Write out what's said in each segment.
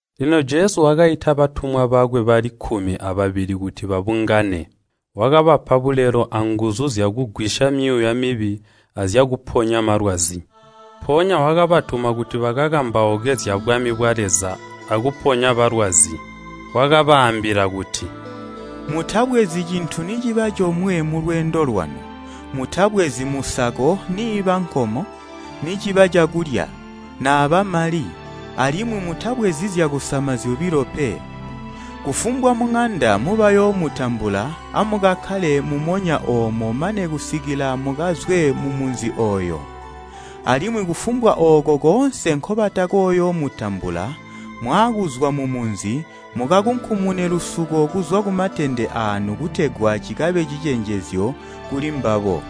Lino Jesu wakaita batumwa bakwe bali kkumi ababili kuti babungane. Wakabapa nguzu zyakugwisya myuuya mibi azyakuponya malwazi. Mpoonya wakabatuma kuti bakakambauke zyabwami bwa Leza akuponya balwazi. Wakabaambila kuti, “Mutabwezi cintu niciba comwe mulweendo lwanu, mutabwezi musako niiba nkomo, niciba cakulya, naaba mali, alimwi mutabwezi zyakusama zyobilo pe. Kufumbwa muŋanda mubayoomutambula, amukakkale mumonya oomo mane kusikila mukazwe mumunzi ooyo. Alimwi kufumbwa ooko koonse nkobatakoyoomutambula, mwaakuzwa mumunzi, mukakunkumune lusuko kuzwa kumatende aanu kutegwa cikabe cicenjezyo kulimbabo.”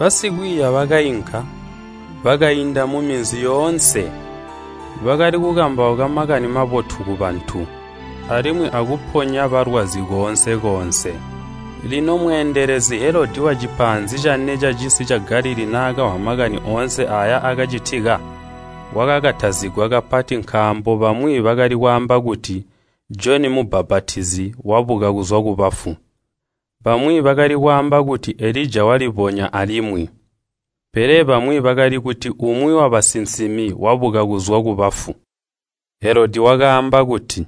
Basikwiiya bakainka, bakainda muminzi yoonse. Bakali kukambauka Makani Mabotu kubantu, alimwi akuponya balwazi koonse-koonse. Lino Mwami Helodi wacisi ca Galilii naakamvwa makani oonse aaya aakacitika, wakakatazigwa kapati nkaambo bamwi bakali kwaamba kuti Joni Mubbapatizi wabuka kuzwa kubafu. Bamwi bakali kwaamba kuti Elija walibonya alimwi. Pele bamwi bakali kuti umwi wabasinsimi wabuka kuzwa kubafu. Helodi wakaamba kuti,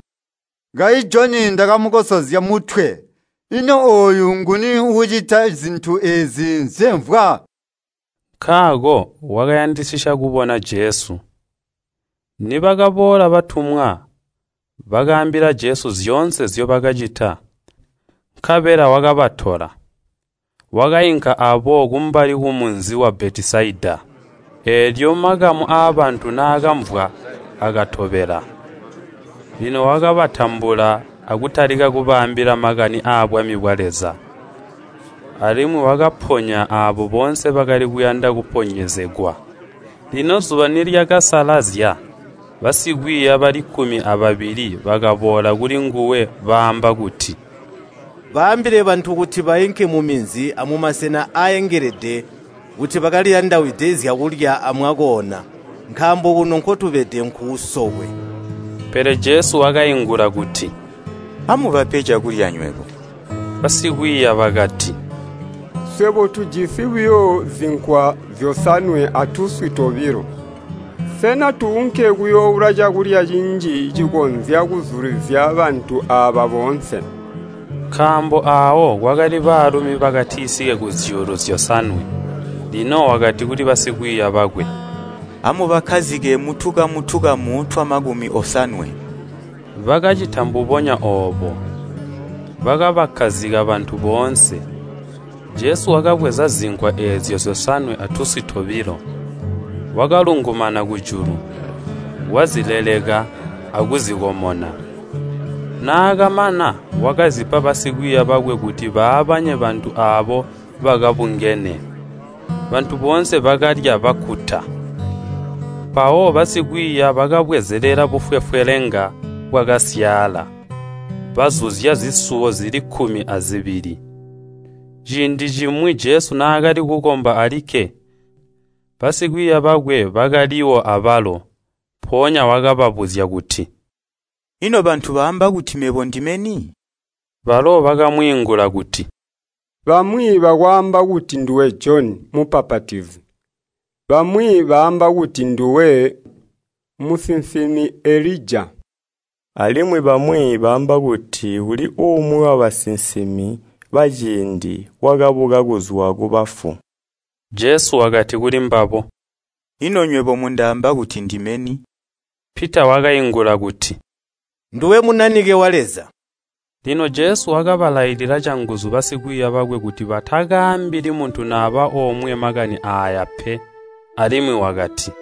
“Kayi Joni ndakamukosozya mutwe, ino ooyu nguni uucita zintu eezi nzyemvwa?” Nkaako wakayandisisya kubona Jesu. Nibakaboola batumwa, bakaambila Jesu zyoonse nzyobakacita. Nkabela wakabatola, wakainka aabo kumbali kumunzi wa Betesaida. Eelyo makamu aabantu naakamvwa akatobela. Lino wakabatambula akutalika kubaambila makani aabwami bwa Leza, alimwi wakaponya aabo boonse bakali kuyanda kuponyezegwa. Lino zuba nilyakasalazya, basikwiiya bali kkumi ababili bakaboola kulinguwe baamba kuti, “Baambile bantu kuti bainke muminzi amumasena aaengelede kuti bakaliyandawide zyakulya amwakoona, nkaambo kuno nkotubede nkuusokwe.” Pele Jesu wakaingula kuti, “Amubape cakulya nywebo.” Basikwiiya bakati, “Swebo tujisi buyo zinkwa zyosanwe atuswi tobilo. Sena tuunke kuyooula cakulya cinji cikonzya kuzulizya bantu aaba boonse?” Nkaambo aawo kwakali baalumi bakatisike kuzyuulu zyosanwe. Lino wakati kuli basikwiiya bakwe, “Amubakkazike mutukamu-tukamu twamakumi osanwe.” Bakacita mbubonya oobo, bakabakkazika bantu boonse. Jesu wakabweza zinkwa eezyo zyosanwe atuswi tobilo, wakalungumana kujulu, wazileleka akuzikomona. Naakamana, wakazipa basikwiiya bakwe kuti baabanye bantu aabo bakabungene. Bantu boonse bakalya bakkuta. Mpawo basikwiiya bakabwezelela bufwefwelenga bwakasyaala, bazuzya zisuwo zili kkumi azibili. Ciindi cimwi Jesu naakali kukomba alikke, basikwiiya bakwe bakaliwo abalo. Mpoonya wakababuzya kuti, “Ino bantu baamba kuti mebo ndime ni?” Balo bakamwiingula kuti, “Bamwi bakwaamba kuti nduwe Joni Mubbapatizi, bamwi baamba kuti nduwe musinsimi Elija, alimwi bamwi baamba kuti uli umwi wabasinsimi baciindi wakabuka kuzwa kubafu.” Jesu wakati kulimbabo, “Ino nywebo mundaamba kuti ndime ni?” Pita wakaingula kuti, “Nduwe Munanike wa Leza.” Lino Jesu wakabalailila canguzu basikwiiya bakwe kuti batakaambili muntu naba omwe makani aaya pe. Alimwi wakati,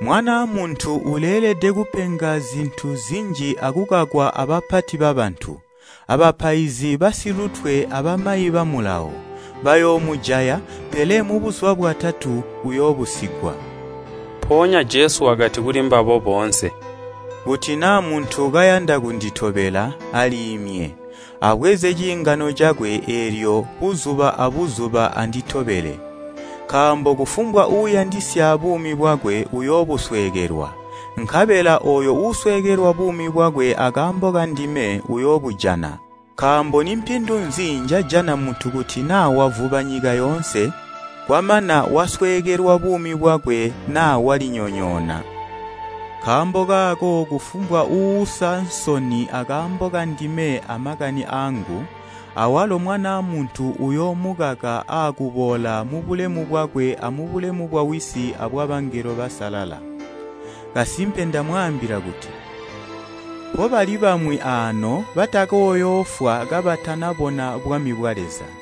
“Mwanaa Muntu uleelede kupenga zintu zinji akukakwa abapati babantu, abapaizi basilutwe abamayi ba Mulawo. Bayoomujaya, pele mubuzuba bwatatu uyoobusigwa.” Mpoonya Jesu wakati kulimbabo boonse, “Kuti naa muntu kayanda kunditobela, aliimye, abweze ciingano cakwe eelyo anditobele. Nkaambo kufumbwa uuyandisya buumi bwakwe uyoobusweekelwa, nkabela ooyo uusweekelwa buumi bwakwe akaambo kandime, uyoobujana. Nkaambo nimpindu nzi njajana muntu kuti naa wavuba nyika yoonse, kwamana wasweekelwa buumi bwakwe naa walinyonyoona? Nkaambo kaako kufumbwa uuusa nsoni akaambo kandime amakani aangu, awalo Mwanaa Muntu uyoomukaka aakuboola mubulemu bwakwe amubulemu bwawisi abwabangelo basalala. Kasimpe ndamwaambila kuti, mpobali bwamwi aano batakooyoofwa kabatanabona bwami bwa Leza.”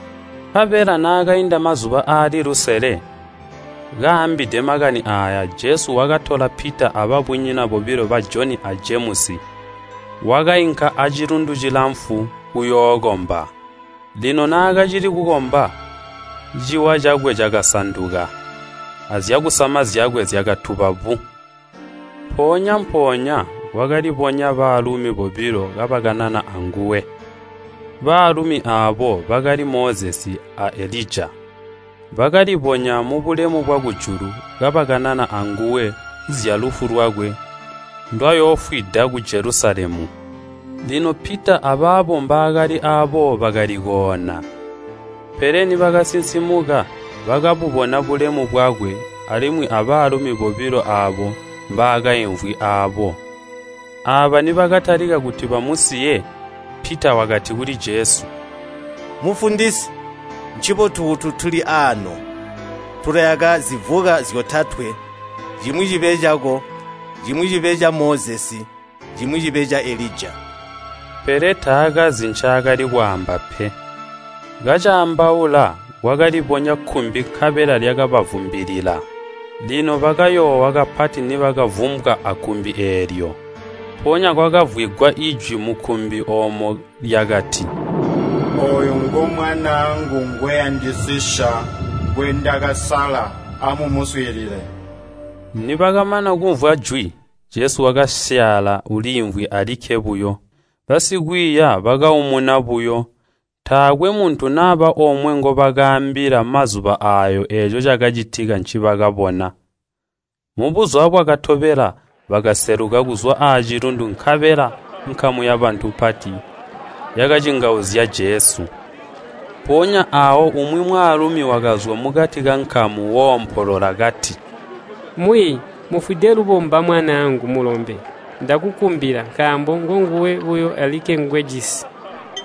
Nkabela naakainda mazuba aali lusele, kaambide makani aaya Jesu wakatola Pita ababunyina bobilo ba Joni a Jemusi wakainka acilundu cilamfu kuyookomba. Lino naakacili kukomba, ciwa cakwe cakasanduka, azyakusama zyakwe zyakatuba bu. Mpoonya-mpoonya kwakalibonya baalumi bobilo kabakanana anguwe. Baalumi aabo bakali Mozesi a Elija. Bakalibonya mubulemu bwakujulu kabakanana anguwe zyalufu lwakwe ndwayoofwida ku Jelusalemu. Lino Pita abaabo mbaakali aabo bakali koona, pele nibakasinsimuka bakabubona bulemu bwakwe alimwi abaalumi bobilo aabo mbaakaimvwi aabo. Aaba nibakatalika kuti bamusiye, Pita wakati kuli Jesu, “Mufundisi, ncibotu kuti tuli aano! Tulayaka zilawo zyotatwe, cimwi cibe cako, cimwi cibe ca Mozesi, cimwi cibe ca Elija.” Pele taakazi ncaakali kwaamba pe. Kacaambaula, kwakalibonya kkumbi nkabela lyakabavumbilila. Lino bakayoowa kapati nibakavumbwa akkumbi eelyo. Mpoonya kwakamvwigwa ijwi mukkumbi oomo lyakati, “Ooyu ngo Mwanaangu ngweyandisisya, ngwendakasala. Amumuswiilile!” Nibakamana kumvwa jwi, Jesu wakasyaala, uliimvwi alikke buyo. Basikwiiya bakaumuna buyo, taakwe muntu naba omwe ngobakaambila mazuba aayo eeco cakacitika ncibakabona. Mubuzuba bwakatobela bakaseluka kuzwa acilundu nkabela nkamu yabantu mpati yakacingauzya Jesu. Mpoonya aawo umwi mwaalumi wakazwa mukati kankamu woompolola kati, “Mwiiyi, mufwide lubomba mwanaangu mulombe, ndakukumbila, nkaambo ngonguwe buyo alikke ngwejisi!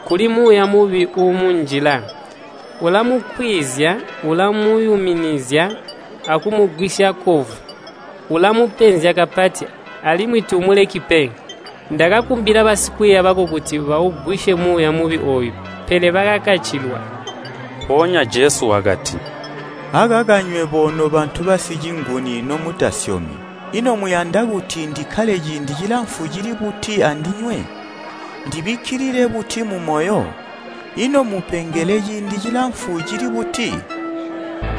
Kuli muuya mubi uumunjila. Ulamukwiizya, ulamuyuminizya akumuzwisya kovu! Ulamupenzya kapati, alimwi tuumuleki pe! Ndakakumbila basikwiiya bako kuti baugwisye muuya mubi ooyu, pele bakakacilwa.” Mpoonya Jesu wakati, “Akaka nywebo nobantu basicinguni nomutasyomi, ino muyanda kuti ndikkale ciindi cilamfu cili buti andinywe? Ndibikkilile buti mumoyo? Ino mmupengele ciindi cilamfu cili buti?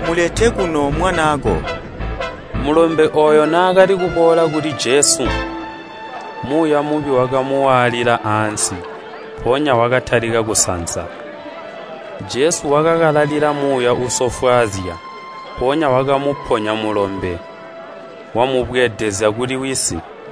Mulete kuno mwanaako.” Mulombe ooyo naakali kuboola kuli Jesu, muuya mubi wakamuwaalila ansi, mpoonya wakatalika kusansa. Jesu wakakalalila muuya uusofwaazya, mpoonya wakamuponya mulombe, wamubweedezya kuli wisi.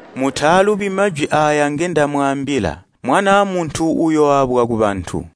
“Mutaalubi majwi aaya ngendamwaambila! Mwanaa Muntu uyooabwa kubantu.”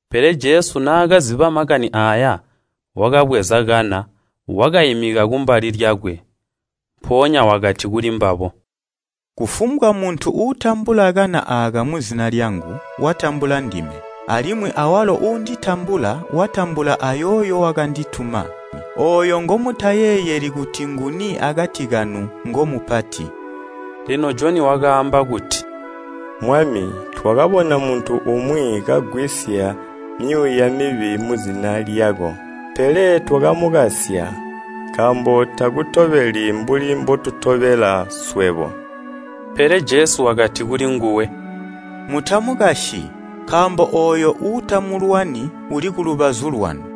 Pele Jesu naakaziba makani aaya, wakabweza kana, wakaimika kumbali lyakwe. Mpoonya wakati kulimbabo, “Kufumbwa muntu uutambula kana aaka muzina lyangu, watambula ndime, alimwi awalo uunditambula, watambula ayooyo wakandituma. Ooyo ngomutayeeyeli kuti nguni akati kanu ngomupati.” Lino Joni wakaamba kuti, “Mwami, twakabona muntu umwi kagwisya myuuya mibi muzina lyako, pele twakamukasya, nkaambo takutobeli mbuli mbotutobela swebo.” Pele Jesu wakati kulinguwe, “Mutamukasyi, nkaambo ooyo uutamulwani uli kulubazu lwanu.”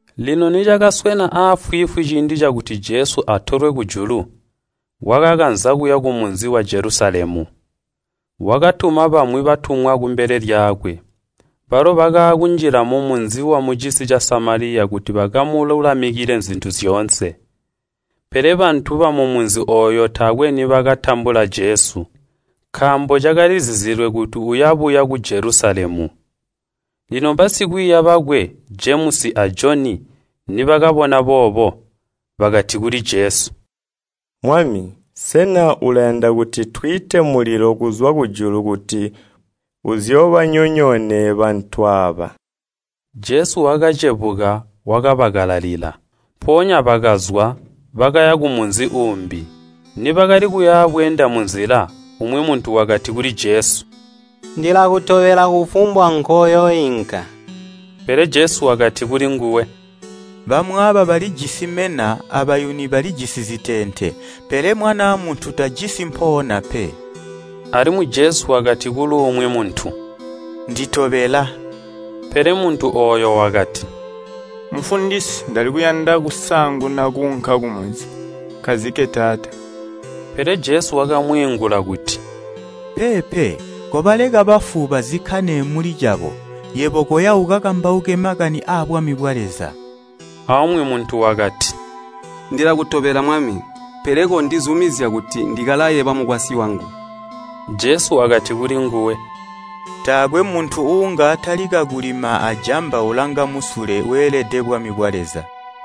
Lino nicakaswena afwiifwi ciindi cakuti Jesu atolwe kujulu, wakakanza kuya kumunzi wa Jelusalemu. Wakatuma bamwi batumwa kumbele lyakwe, balo bakaakunjila mumunzi wamucisi ca Samaliya kuti bakamululamikile zintu zyoonse. Pele bantu bamumunzi ooyu taakwe nibakatambula Jesu, nkaambo cakalizizilwe kuti uyabuya ku Jelusalemu. Lino basikwiiya bakwe, Jemusi a Joni, nibakabona boobo, bakati kuli Jesu, “Mwami, sena ulayanda kuti twiite mulilo kuzwa kujulu kuti uzoobanyonyoone bantu aaba?” Jesu wakacebuka wakabakalalila. Mpoonya bakazwa, bakaya kumunzi uumbi. Nibakali kuyabweenda munzila, umwi muntu wakati kuli Jesu, “Ndilakutobela kufumbwa nkoyooinka.” Pele Jesu wakati kulinguwe, “Bamwaaba balijisi mena abayuni balijisi ziteente, pele Mwanaa Muntu tajisi mpoona pe.” Alimwi Jesu wakati kuluumwi muntu, “Nditobela.” Pele muntu ooyo wakati, “Mufundisi ndali kuyanda kusaanguna kuunka kumunzi nkazike taata.” Pele Jesu wakamwiingula kuti, “Peepe, kobaleka bafu bazikkane muli cabo, yebo koya ukakambauke makani aabwami bwa Leza.” Aumwi muntu wakati, “Ndilakutobela, Mwami, pele kondizumizya kuti ndikalaye bamukwasyi wangu.” Jesu wakati kulinguwe, “Taakwe muntu uunga atalika kulima ajamba ulanga musule, weelede bwami bwa Leza.”